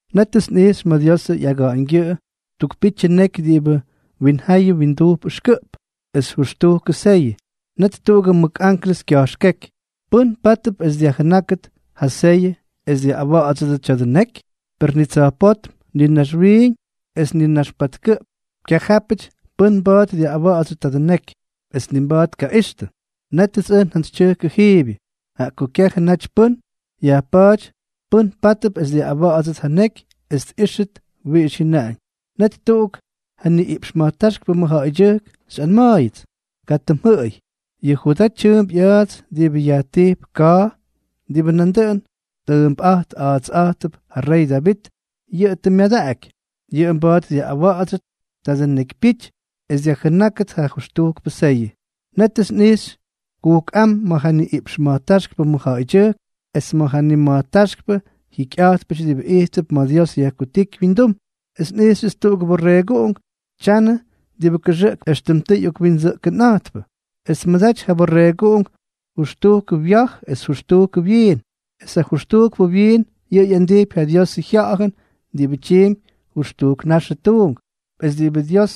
Nétʉts nꞌijxy ma̱ Diosʉ ꞌyaga̱ꞌa̱ñgyʉꞌʉ tuk pityʉ neky diꞌibʉ winjayʉ windujp ʉxkʉꞌp, es jʉxtujkʉ seyʉ. Net tuꞌugʉ mʉk anklʉs kya̱jxkéky: —¿Pʉ́n pátʉp es dyajjʉnákʉt ja seyʉ es dyaꞌꞌawa̱ꞌa̱dsʉdʉ tya̱dʉ neky? Per ni tsa̱jpótm, ni naxwiiñ es ni nax patkʉꞌp kyajápʉty pʉ́n mba̱a̱t dyaꞌꞌawa̱ꞌa̱dsyʉ tadʉ neky, es ni mba̱a̱t tkaꞌixtʉ. Nétʉts ʉj njantsytyʉjkʉ jiibyʉ, jaꞌa ko kyajʉ naty pʉ́n yajpa̱a̱ty pʉ́n pátʉp es dyaꞌꞌawa̱ꞌa̱dsʉt ja neky es tꞌíxʉt wiꞌix jyʉnaꞌañ. Net tuꞌuk ja niꞌiꞌpx ma̱jtáxkpʉ mʉjja̱ꞌa̱ydyʉjk xyꞌanma̱a̱yʉts: —Katʉ mjʉꞌʉy. Yʉ Judaa tyʉʉmp ꞌya̱a̱ts diꞌibʉ yajtijp Ka̱a̱, diꞌibʉ nandʉꞌʉn tʉʉmpꞌa̱jt a̱a̱tsꞌa̱jtʉp ja rey Davit, yʉꞌʉ tʉ myadaꞌaky. Yʉꞌʉ mba̱a̱t dyaꞌꞌawa̱ꞌa̱dsyʉ tadʉ nekypyity es dyajjʉnákʉt ja jʉxtujkpʉ seyʉ. Nétʉts nꞌijxy kujkꞌám ma̱ ja niꞌiꞌpx ma̱jtáxkpʉ mʉjja̱ꞌa̱ydyʉjk es ma̱ ja nima̱jtáxkpʉ jikyꞌa̱jtpʉty diꞌibʉ ijttʉp ma̱ Dios yajkutíky wyindum, es nꞌijxyʉts tuꞌugʉ Borreeguꞌunk tyanʉ diꞌibʉ kʉxʉꞌkp éxtʉm tʉ ꞌyokwindsʉꞌkʉnꞌa̱jtpʉ. Es tmʉdaty yʉ Borreeguꞌunk jʉxtujkʉ wya̱j es jʉxtujkʉ wyiin. Es ja jʉxtujkpʉ wyiin, yʉꞌʉ ꞌyandijpy ja Diosʉ Jya̱ꞌa̱jʉn diꞌibʉ tyiimpy jʉxtujk naxʉ tuunk es diꞌibʉ Dios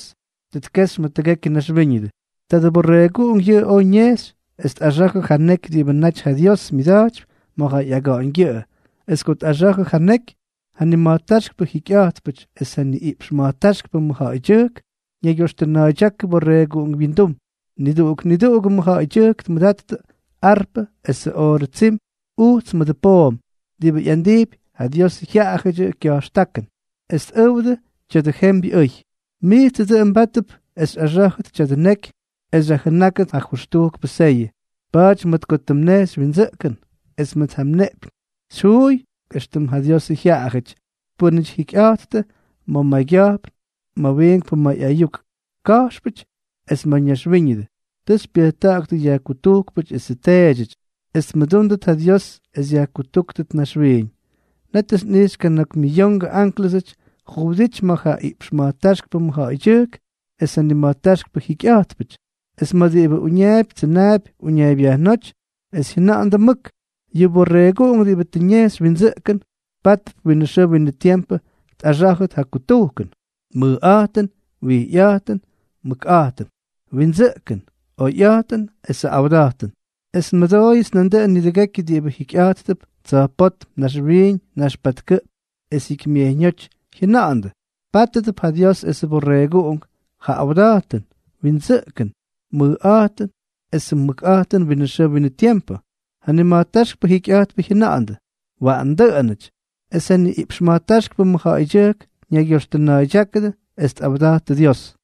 tʉ tkexy ma̱ tʉgekyʉ naxwíñʉdʉ. Tadʉ Borreeguꞌunk yʉꞌʉ oj ñejxy es tꞌaxa̱jʉ ja neky diꞌibʉ naty ja Dios myʉda̱jtypy ma̱ ja ꞌyaga̱ꞌa̱ñgyʉꞌʉ. Es ko tꞌaxa̱jʉ ja neky, ja nima̱jtáxkpʉ jikyꞌa̱jtpʉty es ja niꞌiꞌpx ma̱jtáxkpʉ mʉjja̱ꞌa̱ydyʉjk ñaygyoxtʉna̱a̱ydyákʉ Borreeguꞌunk wyindum. Niduꞌuk niduꞌugʉ mʉjja̱ꞌa̱ydyʉjk tmʉdattʉ arpʉ esʉ oorʉ tsim ujts mʉdʉ poom, diꞌibʉ ꞌyandijpy ja Diosʉ jyaꞌayʉdyʉ kya̱jxtákʉn, es tꞌʉwdʉ tya̱dʉ jembyʉ ʉy: Mijtsʉ dʉꞌʉn mbátʉp es xyꞌaxá̱jʉt tya̱dʉ neky es xyajjʉnákʉt ja jʉxtujkpʉ seyʉ. Pa̱a̱ty mʉt ko tʉ mnejxy windsʉꞌkʉn, es mʉt ja mneꞌpyñ xyjuuy éxtʉm ja Diosʉ jyaꞌayʉty, pʉ́nʉty jikyꞌa̱jttʉ ma̱ maygya̱jpn, ma̱ wiinkpʉ may ayuk ka̱jxpʉty, es ma̱ mayñaxwíñʉdʉ. Tʉ xypyʉjta̱ꞌa̱ktʉ yajkutujkpʉty esʉ teedyʉty, es tmʉdúndʉt ja Dios es yajkutúktʉt naxwiiñ. Nétʉts nꞌijxy kana̱k miyongʉ ánklʉsʉty juwʉdity ma̱ ja iꞌpx ma̱jtáxkpʉ mʉjja̱ꞌa̱ydyʉjk, es ja nima̱jtáxkpʉ jikyꞌa̱jtpʉty, es ma̱ diꞌibʉ uñaapy tsʉnaapy uñaaybyajnóty, es jyʉna̱ꞌa̱ndʉ mʉk: Yʉ Borreeguꞌunk diꞌibʉ tʉ ñejxy windsʉꞌkʉn, pátʉp winʉ xʉʉ winʉ tiempʉ tꞌaxá̱jʉt ja kutujkʉn, mʉjꞌa̱jtʉn, wijyꞌa̱jtʉn, mʉkꞌa̱jtʉn, windsʉꞌkʉn, oyꞌa̱jtʉn esʉ awda̱jtʉn. Es nmʉdooyʉts nandʉꞌʉn nidʉgekyʉ diꞌibʉ jikyꞌa̱jttʉp tsa̱jpótm, naxwiiñ, nax patkʉꞌp, es jikymyejyñóty jyʉna̱ꞌa̱ndʉ: Pátʉdʉp ja Dios esʉ Borreeguꞌunk ja awda̱jtʉn, windsʉꞌkʉn, mʉjꞌa̱jtʉn esʉ mʉkꞌa̱jtʉn winʉ xʉʉ winʉ tiempʉ. Ja nima̱jtáxkpʉ jikyꞌa̱jtpʉ jyʉna̱ꞌa̱ndʉ: —Waꞌan dʉꞌʉnʉty. Es ja niꞌiꞌpx ma̱jtáxkpʉ mʉjja̱ꞌa̱ydyʉjk ñaygyoxtʉna̱a̱ydyákʉdʉ es tꞌawda̱jttʉ Dios.